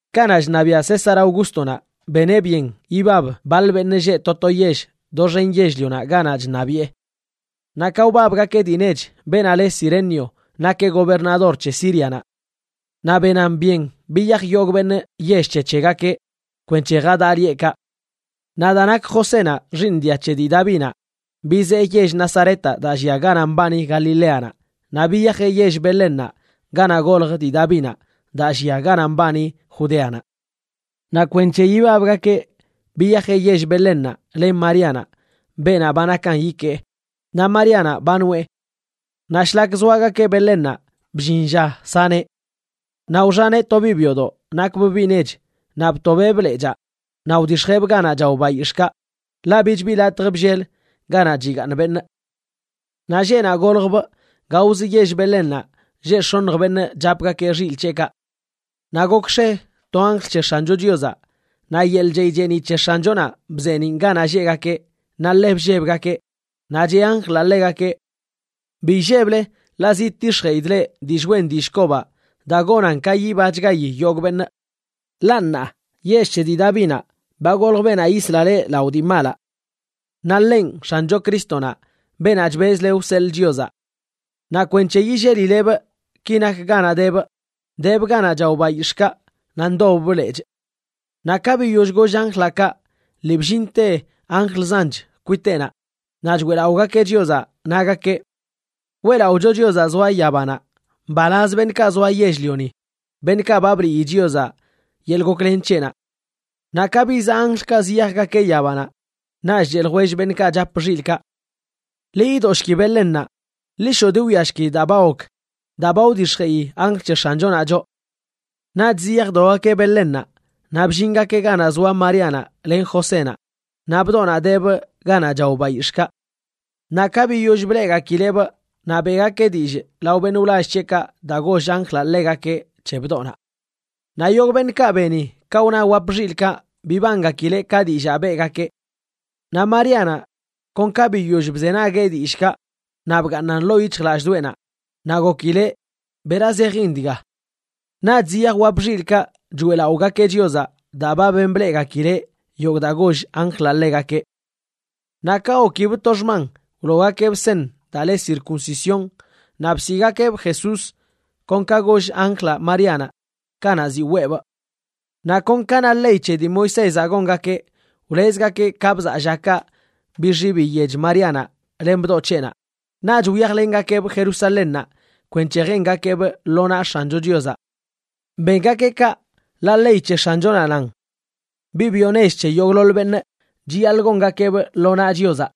Kanaꞌ chṉabiaꞌ César Augústonaꞌ, beneꞌ byen ibab baḻ beṉꞌ lleꞌ to to yell doxen yell-lionaꞌ ganaꞌ chṉabiꞌe. Naꞌ ka wbabgakeꞌ dii nech, beenaꞌ le Cirenio nakeꞌ gobernador c̱he Sírianaꞌ. Naꞌ benan byen biyaj yogꞌ beṉꞌ yell c̱he c̱hegakeꞌ kwenc̱he jadaꞌ lieꞌkaꞌ. Naꞌ daa nak Josénaꞌ xiiṉ dia c̱he dii Davinaꞌ, bizee yell Nazaretaꞌ daa llia ganaꞌ mbani Galileanaꞌ, naꞌ biyajeꞌ yell Belénnaꞌ ganaꞌ golj dii Davinaꞌ, daa llia ganaꞌ mbani Judeanaꞌ. Naꞌ kwenc̱he ibabgakeꞌ biyajeꞌ yell Belénnaꞌ len Maríanaꞌ, beenaꞌ ba nakan ikee. Naꞌ Maríanaꞌ ba noꞌe. Naꞌ shlak zoagakeꞌ Belénnaꞌ, bllin lla saneꞌ. Naꞌ wxaneꞌ to biꞌ byodoꞌ nakbꞌ biꞌ nech, naꞌ btobeꞌbꞌ lechaa naꞌ wdix̱jeꞌbꞌ ganaꞌ chao bayix̱ꞌkaꞌ, ḻaꞌ bich bi latj bllel ganaꞌ chigaaṉ beṉꞌ. Naꞌ lleꞌnaꞌ goljbꞌ, gaozə yell Belénnaꞌ lleꞌ x̱oṉj beṉꞌ chapgakeꞌ xilꞌ c̱heꞌkaꞌ. Naꞌ gokx̱e to anjl c̱he X̱ancho Chiozaꞌ, naꞌ yeḻꞌ chey cheeniꞌ c̱he X̱anchonaꞌ bzeeniꞌn ganaꞌ lleꞌgakeꞌ, naꞌ ḻe bllebgakeꞌ. Naꞌ cheꞌ anjlaꞌ ḻegakeꞌ: ―Bi illeble, ḻaꞌ zidtix̱jeꞌidꞌ leꞌ dillꞌ wen dillꞌ kobaꞌ daa gonan ka yibachgayi yogꞌ beṉꞌ. Ḻaꞌ ṉaa yell c̱he dii Davinaꞌ ba golj beenaꞌ yisla leꞌ lao dii malaꞌ. Naꞌ ḻenꞌ X̱ancho Crístonaꞌ, beenaꞌ chbezle wseḻꞌ Chiozaꞌ. Naꞌ kwenc̱he yillelilebꞌ, ki nak ganaꞌ debꞌ: debꞌ ganaꞌ chao bayix̱ꞌkaꞌ naꞌ ndobbꞌ lechꞌ. Naꞌ ka biyoll goll anjlaꞌ kaꞌ, lii bllinte anjl zanch kwiteꞌnaꞌ, naꞌ choeꞌlaꞌogakeꞌ Chiozaꞌ, nagakeꞌ: ¡Weꞌlaꞌocho Chiozaꞌ zoa yabanaꞌ! Mbalaz beṉꞌkaꞌ zoa yell-lioni, beṉꞌkaꞌ ba bliꞌyi Chiozaꞌ yeḻꞌ goklen c̱heꞌnaꞌ. Naꞌ ka bizaꞌ anjlkaꞌ ziyajgakeꞌ yabanaꞌ, naꞌch cheꞌ ljwell beṉꞌkaꞌ chap xilꞌkaꞌ: ―Ḻi yidoshki Belénnaꞌ, ḻi shoꞌ diwiashki daa ba gok, daa ba wdix̱jeꞌi anjl c̱he X̱anchonaꞌ choꞌ. Naꞌch ziyajdogakeꞌ Belénnaꞌ naꞌ bllingakeꞌ ganaꞌ zoa Maríanaꞌ len Josénaꞌ, naꞌ bdoꞌnaꞌ debꞌ ganaꞌ chao bayix̱ꞌkaꞌ. Naꞌ ka biyoll bleꞌgakileꞌbꞌ, naꞌ beꞌgakeꞌ dillꞌ lao beṉꞌ wlall c̱heꞌkaꞌ daa goll anjlaꞌ ḻegakeꞌ c̱he bdoꞌnaꞌ. Naꞌ yogꞌ beṉꞌkaꞌ beni ka wna wap xilꞌkaꞌ bibangakileꞌ ka dillaa beꞌgakeꞌ. Naꞌ Maríanaꞌ kon ka biyoll bzenagueꞌ dillꞌkaꞌ naꞌ bgaaṉan ḻoo yic̱hjlallꞌdoꞌenaꞌ, naꞌ gokileꞌ bera zejin dga. Naꞌch ziyaj wap xilꞌkaꞌ choeꞌlaꞌogakeꞌ Chiozaꞌ daa ba ben bleꞌgakileꞌ yogꞌ daa goll anjlaꞌ ḻegakeꞌ. Naꞌ ka gokibꞌ to xman, wloogakeꞌbꞌ seṉ daa le circuncisión, naꞌ bsiꞌgakeꞌbꞌ Jesús kon ka goll anjlaꞌ Maríanaꞌ kanaꞌ ziꞌ weebꞌ. Naꞌ kon ka na ley c̱he dii Moisézaꞌ gongakeꞌ, wlezgakeꞌ ka bzaa llakaꞌ bixi biyech Maríanaꞌ len bdoꞌ c̱heꞌnaꞌ, naꞌch wyajlengakeꞌbꞌ Jerusalénnaꞌ kwenc̱he jengakeꞌbꞌ lo naꞌ X̱ancho Chiozaꞌ. Bengakeꞌ kaꞌ, ḻaꞌ ley c̱he X̱anchonaꞌ nan: “Biꞌ byo nech c̱he yogꞌḻoḻ beṉꞌ, chiyaḻꞌ gongakeꞌbꞌ lo naꞌ Chiozaꞌ.”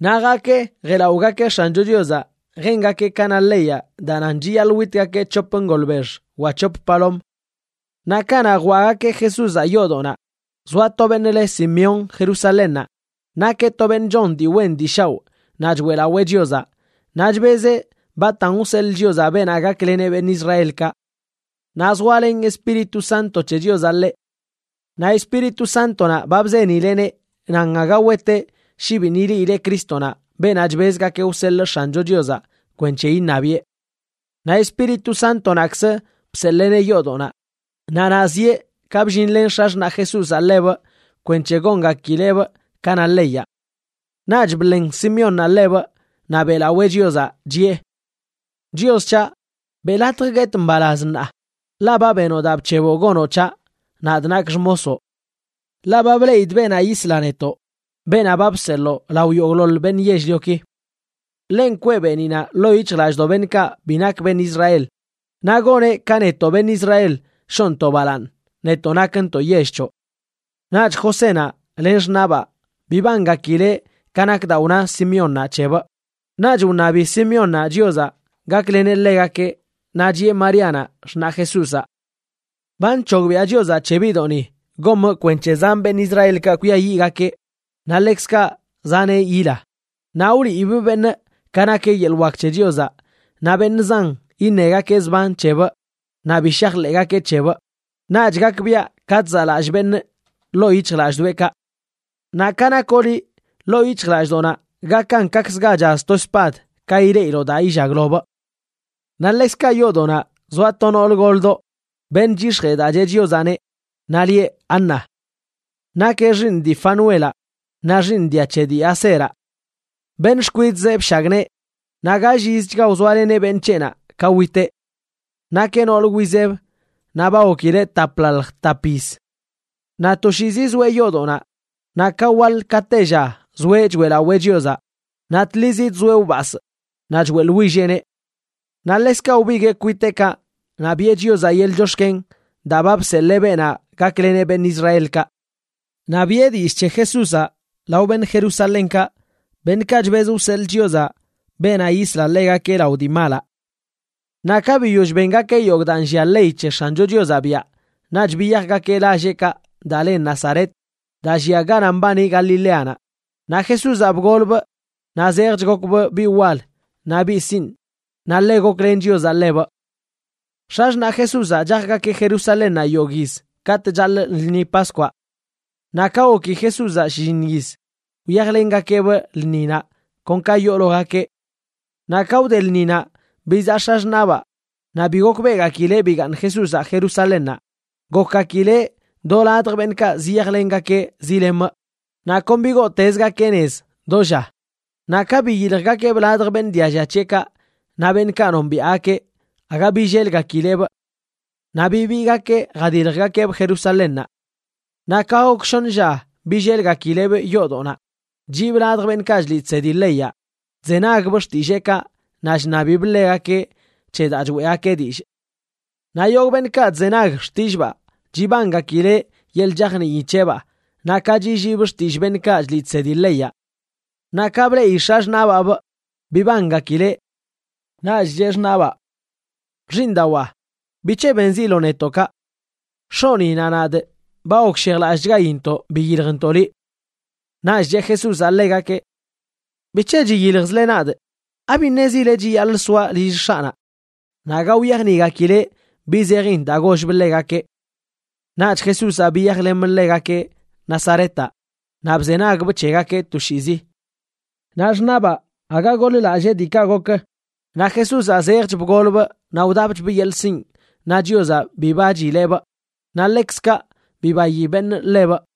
Naꞌ jaakeꞌ jeꞌlaꞌogakeꞌ X̱ancho Chiozaꞌ jengakeꞌ ka na leyaꞌ daa nan chiyaḻꞌ witgakeꞌ c̱hop ngolbex wa c̱hop palom. Naꞌ kanaꞌ jwaꞌgakeꞌ Jesúzaꞌ yoodoꞌnaꞌ, zoa to beṉꞌ le Simeón Jerusalénnaꞌ. Nakeꞌ to beṉꞌ chon dii wen dii shaoꞌ naꞌ choeꞌlawee Chiozaꞌ, naꞌ chbezeꞌ batan wseḻꞌ Chiozaꞌ beenaꞌ gakleneꞌ beṉꞌ Israelkaꞌ. Naꞌ zoalen Espíritu Santo c̱he Chiozaꞌ ḻeꞌ. Naꞌ Espíritu Sántonaꞌ ba bzenileꞌneꞌ nan aga weteꞌ shi biṉꞌ ileꞌileꞌ Crístonaꞌ, beenaꞌ chbezgakeꞌ wseḻꞌ X̱ancho Chiozaꞌ kwenc̱he iṉabiꞌe. Naꞌ Espíritu Sántonaꞌkz bseḻeeneꞌ yoodoꞌnaꞌ, naꞌ naꞌ zieꞌ ka bllinlen x̱axṉaꞌ Jesúzaꞌ ḻebꞌ kwenc̱he gongakileꞌbꞌ ka na leyaꞌ. Naꞌch bḻen Simeónnaꞌ ḻebꞌ naꞌ beꞌlawee Chiozaꞌ, chiꞌe: Chios c̱haꞌ, beꞌ latj guetꞌ mbalaz ṉaa, ḻaꞌ ba benoꞌ daa bc̱heboꞌ gonoꞌ c̱haꞌ, nadꞌ nakꞌ xmosoꞌ. Ḻaꞌ ba bleꞌidꞌ beenaꞌ yisla netoꞌ, beenaꞌ ba bseḻoo lao yogꞌḻoḻ beṉꞌ yell-lioki. Ḻenꞌ kwee beeniꞌnaꞌ ḻoo yic̱hjlallꞌdoꞌ beṉꞌkaꞌ bi nakgakeꞌ beṉꞌ Israel. Naꞌ goneꞌ ka netoꞌ beṉꞌ Israel shoꞌntoꞌ balaaṉ, netoꞌ nakntoꞌ yell c̱hoꞌ. Naꞌch Josénaꞌ len xṉaꞌba bibangakileꞌ ka nak daa wna Simeónnaꞌ c̱hebꞌ. Naꞌch wṉabi Simeónnaꞌ Chiozaꞌ gakleneꞌ ḻegakeꞌ, naꞌ chiꞌe Maríanaꞌ, xṉaꞌ Jesúzaꞌ: ―Ba nc̱hogbiꞌa Chiozaꞌ c̱he biꞌdoꞌni gomꞌ kwenc̱he zan beṉꞌ Israelkaꞌ kwiayiꞌgakeꞌ naꞌ ḻekzkaꞌ zaneꞌ yila. Naꞌ wliibꞌ beṉꞌ ka nak yeḻꞌ wak c̱he Chiozaꞌ, naꞌ beṉꞌ zan iṉegakeꞌ zban c̱hebꞌ naꞌ bi shajḻeꞌgakeꞌ c̱hebꞌ, naꞌch gakbiaꞌ ka chzaꞌlallꞌ beṉꞌ ḻoo yic̱hjlallꞌdoꞌekaꞌ. Naꞌ ka nakoꞌ liꞌ, ḻoo yic̱hjlallꞌdoꞌnaꞌ gakan kaꞌkzə ga chaz to spad ka ileꞌiloꞌ daa illaglobꞌ. Naꞌ ḻekzkaꞌ yoodoꞌnaꞌ zoa to nool goldoꞌ, beṉꞌ chyix̱jee daa cheꞌ Chiozaꞌneꞌ, naꞌ lieꞌ Ana. Nakeꞌ xiiṉ dii Fanuelaꞌ naꞌ xiiṉ dia c̱he dii Aseraꞌ. Beṉꞌ xkwidꞌzeꞌ bshagnee, naꞌ gall yizchga wzoaleneꞌ beṉꞌ c̱heꞌnaꞌ ka witeꞌ. Nakeꞌ noolə wizeb naꞌ ba gokileꞌ taplaḻj tap yiz. Naꞌ toshiizi zoeꞌ yoodoꞌnaꞌ, naꞌ ka waḻ ka tella zoeꞌ choeꞌlawee Chiozaꞌ, naꞌ tlizi chzoeꞌ wbasꞌ naꞌ choeꞌḻwilleꞌneꞌ. Naꞌ ḻekzkaꞌ wbiguee kwiteꞌkaꞌ naꞌ biꞌe Chiozaꞌ yeḻꞌ chox̱ken daa ba bseḻee beenaꞌ gakleneꞌ beṉꞌ Israelkaꞌ. Naꞌ biꞌe dillꞌ c̱he Jesúzaꞌ lao beṉꞌ Jerusalénkaꞌ, beṉꞌkaꞌ chbez wseḻꞌ Chiozaꞌ beenaꞌ yisla ḻegakeꞌ lao dii malaꞌ. Naꞌ ka biyoll bengakeꞌ yogꞌ daa nllia ley c̱he X̱ancho Chiozaꞌ biaꞌ, naꞌch biyajgakeꞌ lalleꞌkaꞌ daa le Nazaret daa llia ganaꞌ mbani Galileanaꞌ. Naꞌ Jesúzaꞌ bgolbꞌ naꞌ zejch gokbꞌ biꞌ wal naꞌ biꞌ sinꞌ, naꞌ ḻe goklen Chiozaꞌ ḻebꞌ. X̱axṉaꞌ Jesúzaꞌ chajgakeꞌ Jerusalénnaꞌ yogꞌ yiz katꞌ chaḻꞌ lṉi Paskwaꞌ. Naꞌ ka goki Jesúzaꞌ shlliṉ yiz, wyajlengakeꞌbꞌ lṉinaꞌ kon ka yoologakeꞌ. Naꞌ ka wde lṉinaꞌ bizaꞌ x̱axṉaꞌbaa, naꞌ bi gokbeꞌgakileꞌ bigaaṉ Jesúzaꞌ Jerusalénnaꞌ. Gokgakileꞌ do ladj beṉꞌkaꞌ ziyajlengakeꞌ zilemꞌ, naꞌ kon bigootezgakeꞌ nez do lla. Naꞌ ka biyiljgakeꞌbꞌ ladj beṉꞌ dialla c̱heꞌkaꞌ naꞌ beṉꞌkaꞌ nombiaꞌgakeꞌ aga billelgakileꞌbꞌ. Naꞌ bibiigakeꞌ jadiljgakeꞌbꞌ Jerusalénnaꞌ. Naꞌ ka gok shoṉə lla billelgakileꞌbꞌ yoodoꞌnaꞌ, chiꞌbꞌ ladj beṉꞌkaꞌ chliꞌ chsedi leyaꞌ chzenagbꞌ xtilleekaꞌ naꞌ chṉabibꞌ ḻegakeꞌ c̱he daa choeꞌgakeꞌ dillꞌ. Naꞌ yogꞌ beṉꞌkaꞌ chzenag xtillꞌbaa chibangakileꞌ yeḻꞌ chajnii c̱heꞌbaa naꞌ ka chilliibꞌ xtillꞌ beṉꞌkaꞌ chliꞌ chsedi leyaꞌ. Naꞌ ka bleꞌi x̱axṉaꞌbaabꞌ bibangakileꞌ. Naꞌch cheꞌ xṉaꞌbaa: ―Xiiṉdawaa, ¿bic̱he benziloꞌ netoꞌ kaꞌ? X̱oꞌni naꞌ nadꞌ ba gokshejlallꞌchgaintoꞌ biyiljntoꞌ liꞌ. Naꞌch cheꞌ Jesúzaꞌ ḻegakeꞌ: ―¿Bic̱he chiyiljzle nadꞌ? ¿Abi ṉezile chiyaḻꞌ soaꞌ lill X̱aꞌnaꞌ? Naꞌ aga wyajniꞌgakileꞌ bi zejin daa gollbꞌ ḻegakeꞌ. Naꞌch Jesúzaꞌ biyajlemꞌ ḻegakeꞌ Nazaretaꞌ naꞌ bzenagbꞌ c̱hegakeꞌ toshiizi. Naꞌ xṉaꞌbaa aga goḻ-lallee diikaꞌ gok. Naꞌ Jesúzaꞌ zejch bgolbꞌ naꞌ wdapchbꞌ yeḻꞌ sinꞌ, naꞌ Chiozaꞌ bibachileꞌbꞌ, naꞌ ḻekzkaꞌ bibayi beṉꞌ ḻebꞌ.